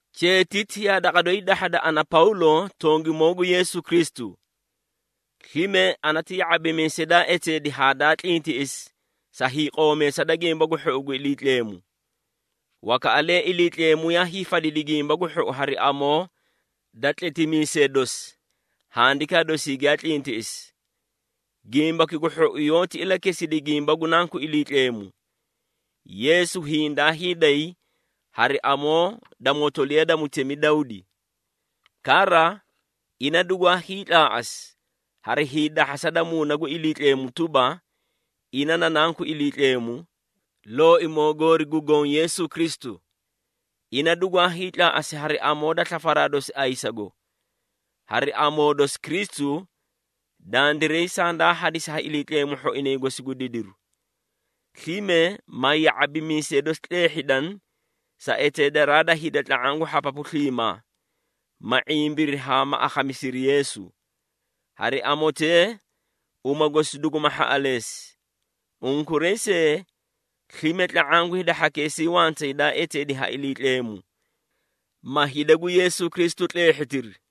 Cheetiti yaa daqa doyi dahhada, ana Pawlo tongimoo gu Yeesu Kristu, slime ana ti ya⁄abimiisay daa eteedi haa daa tlintiꞌisi sa hiiqoomeesa da Gimba gu Hhou gu Iliitleemu. Wakaꞌalee Iliitleemu yaa hiifadidi Gimbaki gu Hhou hari amoo da tletimiisee dosi Handikaa dosii giyaa tlintiꞌisi. Gimbaki gu Hhou yoóti ilakesidi gimba gu Nanku Iliitleemu. Yeesu hiĩ daa hiiday hari amoo da motoliya da mutemi Dawdi. Kara, ina dugwaa hiitlaaꞌasi hari hiidahhasa da Muuna gu Iliitleemu tuba, ina na Nanku Iliitleemu, Looimoo goori gu Goõ Yeesu Kristu. Ina dugwaa hiitlaaꞌasi hari amoo da slafaraa dosi ayisago. Hari amoo dosi Kristu, dandiray sandaa hadisi ha Iliitleemu hhoinay gosi gu didiru, slime ma ya⁄abimiisee dosi tleehhidani sa eteedaraa da hida tla⁄aã gu hhapapu sliimaa, ma ⁄imbiri haa ma akhamisiri Yeesu. Hari amotee uma gosi duguma hhaꞌaleesi. Unkuray see, slime tla⁄aã gu hida hhakeesii wantay daa eteedi ha Iliitleemu, ma hida gu Yeesu Kristu tleehhitiri.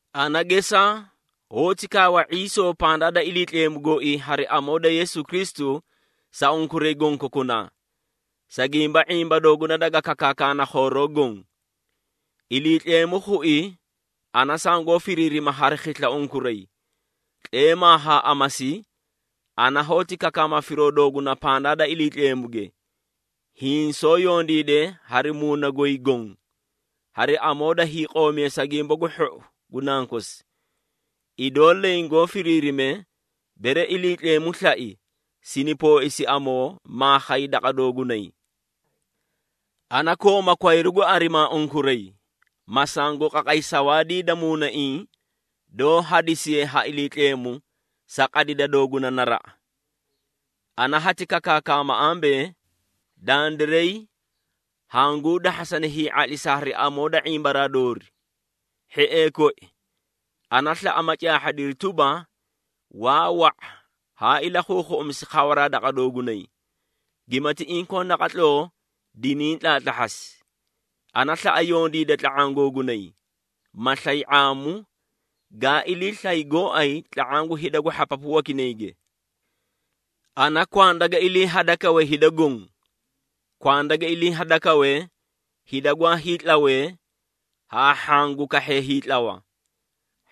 Ana gesaa, hoóti kaawa ⁄iisoo pandaa da Iliitleemu gooii hari amoo da Yeesu Kristu sa unkuray gonkokunaa, sa gimba ⁄imba dooguna daga kakaakana khooroo goõ. Iliitleemu khui ana sangoó firiirima hari khisla unkuray. Tleemaa haa amasi, ana hoóti kakaama firoo dooguna pandaa da Iliitleemuge, hiĩ soó yondiide hari muuna goy goõ hari amoo da hiiqoomeesa Gimba gu Hhou gu Nankosi. Idoo leẽ goó firiirime, bere Iliitleemu slai, sini pooisi amoo, maa khay daqa doogunay. Ana kooma kwayru gu arimaa unkuray, ma sangu qaqay sawaadii da muunaiĩ doó hadisiye ha Iliitleemu sa qadida dooguna naraꞌa. Ana hati kakaakama ambee, dandiray hanguu dahhasana hii⁄atlisa hari amoo da ⁄imbaraa doori. Hhiee koi, ana slaꞌa ma caahhadiri tuba, waa wa⁄a haa ilakhuukhuꞌusi khawaraa daqa doogunay, gimati inkoo naqatloo diniĩ tlaatlahhasi. Ana slaꞌa yondiida tla⁄aã googunay, ma slay ⁄aamu, gaa ilii slay gooay tla⁄aã gu hida gu hhapapu wakinayge. Ana kwanda ga ilii hadakawe hida goõ. Kwanda ga ilii hadakawe hida gwaa hiitlawee haa hhaã gu kahhee hiitlawa,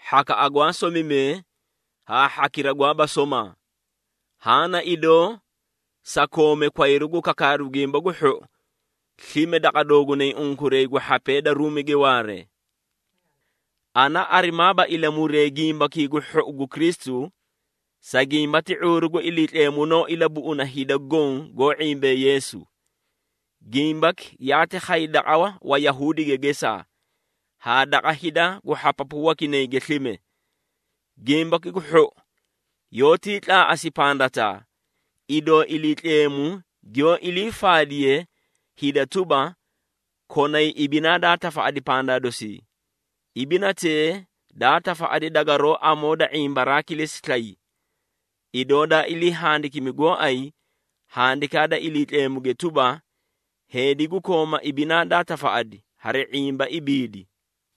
hhakaꞌa gwaa somimee haa hhakira gwaaba somaa. Haã na idoo sa koome kwayru gu kakaaru Gimba gu Hhou slime daqa doogunay unkuray gu hhapee da Ruumige waaree. Ana arimaaba ilamuree Gimbakii gu Hhou gu Kristu, sa gimba ti ⁄uuru gu Iliitleemu noó ilabuꞌuna hida goõ goó ⁄imbee Yeesu. Gimbaki yaati khay daqa Wayahuudige gesaa, haa daqa hida gu hhapapu wakinayge slime. Gimbaki gu Hhou yoótii tlaaꞌasi pandataa, idoo Iliitleemu giyoó ilii faadiye hida tuba, konay ibinaa daa tafaꞌadi pandaa dosii. Ibinatee daa tafaꞌadi dagaroó amoo da ⁄imbaraa kilesi slay. Idoo daa ilii handikimi gooay Handikaa da Iliitleemu tuba, “Heedi gu kooma ibinaa daa tafaꞌadi hari ⁄imba ibiidi.”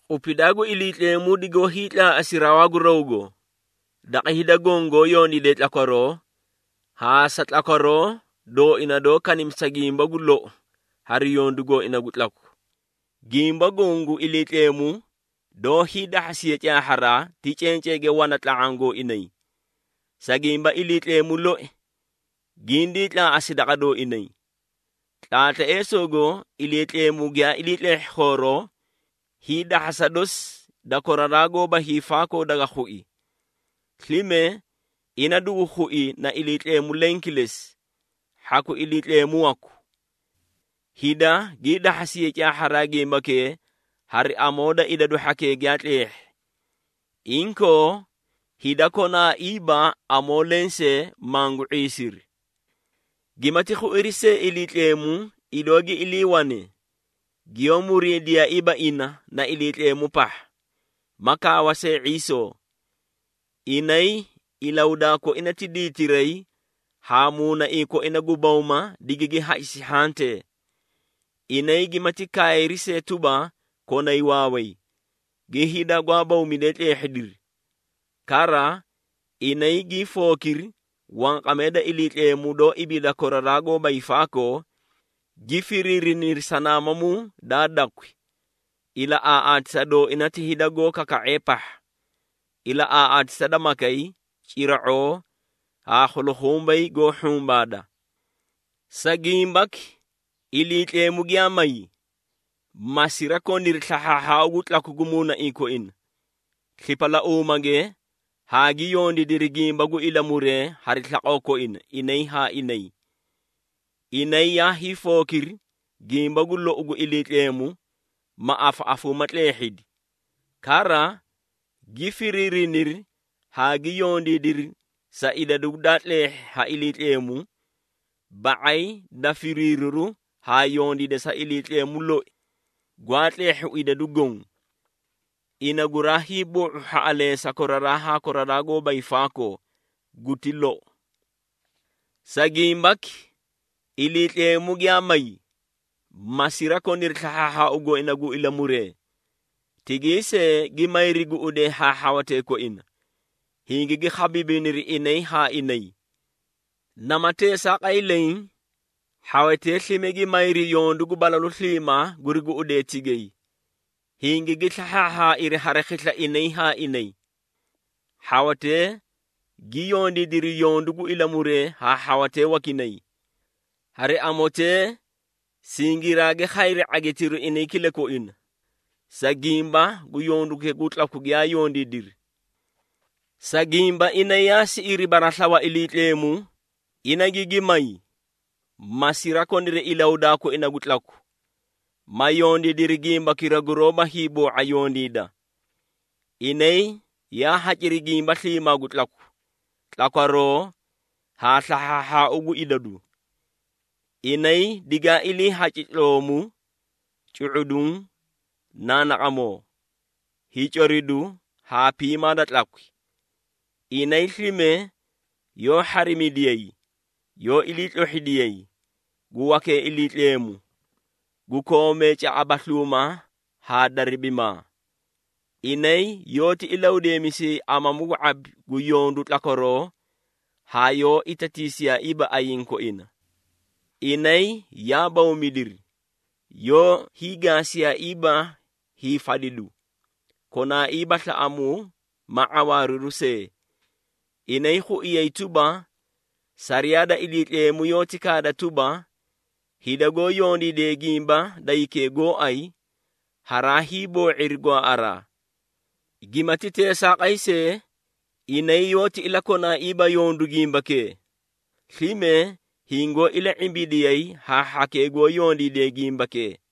Qupidaa gu Iliitleemu digoó hiitlaaꞌasi rawaa gu rawgo, daqa hida goõ goó yondiidee tlakwaroo, haa sa tlakwaroo dooina doó kanimisa gimba gu lou hari yondu gooina gu tlaku. Gimba goõ gu Iliitleemu doó hiidahhasiye caahharaa, ti cenceege wana tla⁄aã gooinay, sa gimba Iliitleemu loi gindii tlaaꞌasi daqa dooinay. Tlaatleesoogo Iliitleemu giyaa ilii tleehhi khooroo, hiidahhasa dosi da koraraa gooba hiifaakoo daga khui. Slime, ina dugu khui na Iliitleemu leẽ kilesi, hhaku Iliitleemu waku. Hida gii dahhasiyay caahharaa gimbakee hari amoo da idadu hhakee giyaa tleehhi. Inkoo, hida konaaiiba amoo lensee mangu ⁄iisiri. Gimati khuiri see Iliitleemu, idoo gi iliiwane, giyoó muriidiyaaiiba ina na Iliitleemu pahha, ma kaawa see ⁄iisoo. Inay ilahudaa koina ti diitiray haa muunaiĩ koina gu bawma digigi hacisi hhantee. Inay gimati kaayri see tuba, konay waaway, gi hida gwaa bawmidee tleehhidiri. Kara, inay gii fookiri wanqamee da Iliitleemu doó ibiida koraraa gooba hiifaakoo, gi firiiriniri sanaamamuu daa dakwi, ilaꞌaaꞌaatisa dooina ti hida goó kaka⁄ee pahha, ilaꞌaaꞌaatisa da makay, cira⁄oo haa khulukhumbay goó hhumbaadaa. Sa gimbaki, Iliitleemu giyaa may, ma sirakoniri slahhaahhaau gu tlaku gu muunaiĩ koina, slipalauumage haa gi yondiidiri gimba gu ilamuree hari slaqoo koina, inay haa inay. Inay yaa hiifookiri gimba gu lou gu Iliitleemu, ma afaꞌafuumaa tleehhidi. Kara, gi firiiriniri haa gi yondiidiri sa idadu daa tleehhi ha Iliitleemu ba⁄ay da firiiriru haa yondiida sa Iliitleemu loi gwaa tleehhu idadu goõ. Ina guraa hiiboo⁄u hhaꞌaleesa koraraa haa koraraa gooba hiifaakoo! Guti lou. Sa gimbaki, Iliitleemu giyaa may, ma sirakoniri slahhaahhaau gooina gu ilamuree. Tigay see gi mayri guꞌudee haa hhawatee koina, hingigi khabiibiniri inay haa inay. Nama teesaaqay leẽ, hhawatee slime gi mayri yondu gu balalu sliimaa guri guꞌudee tigay, hingigi slahhaahhaairi hari khisla inay haa inay. Hhawatee gi yondiidiri yondu gu ilamuree haa hhawatee wakinay. Hari amotee, singiraagi khayri ⁄agitiru inay kilakoina, sa gimba gu yondukee gu tlaku giyaa yondiidiri. Sa gimba inay yaa siꞌiri baraslawa Iliitleemu, ina gigi may, ma sirakoniri ilahudaa koina gu tlaku, ma yondiidiri gimbakira guroóba hiiboo⁄a yondiida. Inay yaa haciri gimba sliimaa gu tlaku, tlakwaroo haa slahhaahhaau gu idadu. Inay digaa iliihaci tloomu, cu⁄uduũ, naanaqamoo, hiicoridu haa piimaa da tlakwi. Inay slime yoó hharimidiyay, yoó iliitlohhidiyay, gu wakee Iliitleemu, gu koomee caꞌabasluuma haa daribimaa. Inay yoóti ilahudeemisiyay amamu gu ⁄abi gu yondu tlakwaroo haa yoó itatiisiyaaiiba ayiĩ koina. Inay yaa bawmidiri, yoó hiigaasiyaaiiba hiifadidu, konaaiiba slaꞌamuu ma ⁄awaariru see. Inay khuiyay tuba, sariyaa da Iliitleemu yoóti kaada tuba, hida goó yondiide gimba da hikee gooay, haraa hiiboo⁄iri gwaaꞌaraa. Gimati teesaaqay see, inay yoóti ilakonaaiiba yondu gimbakee, slime hingoó ila⁄imbidiyay haa hhakee goó yondiidee gimbakee.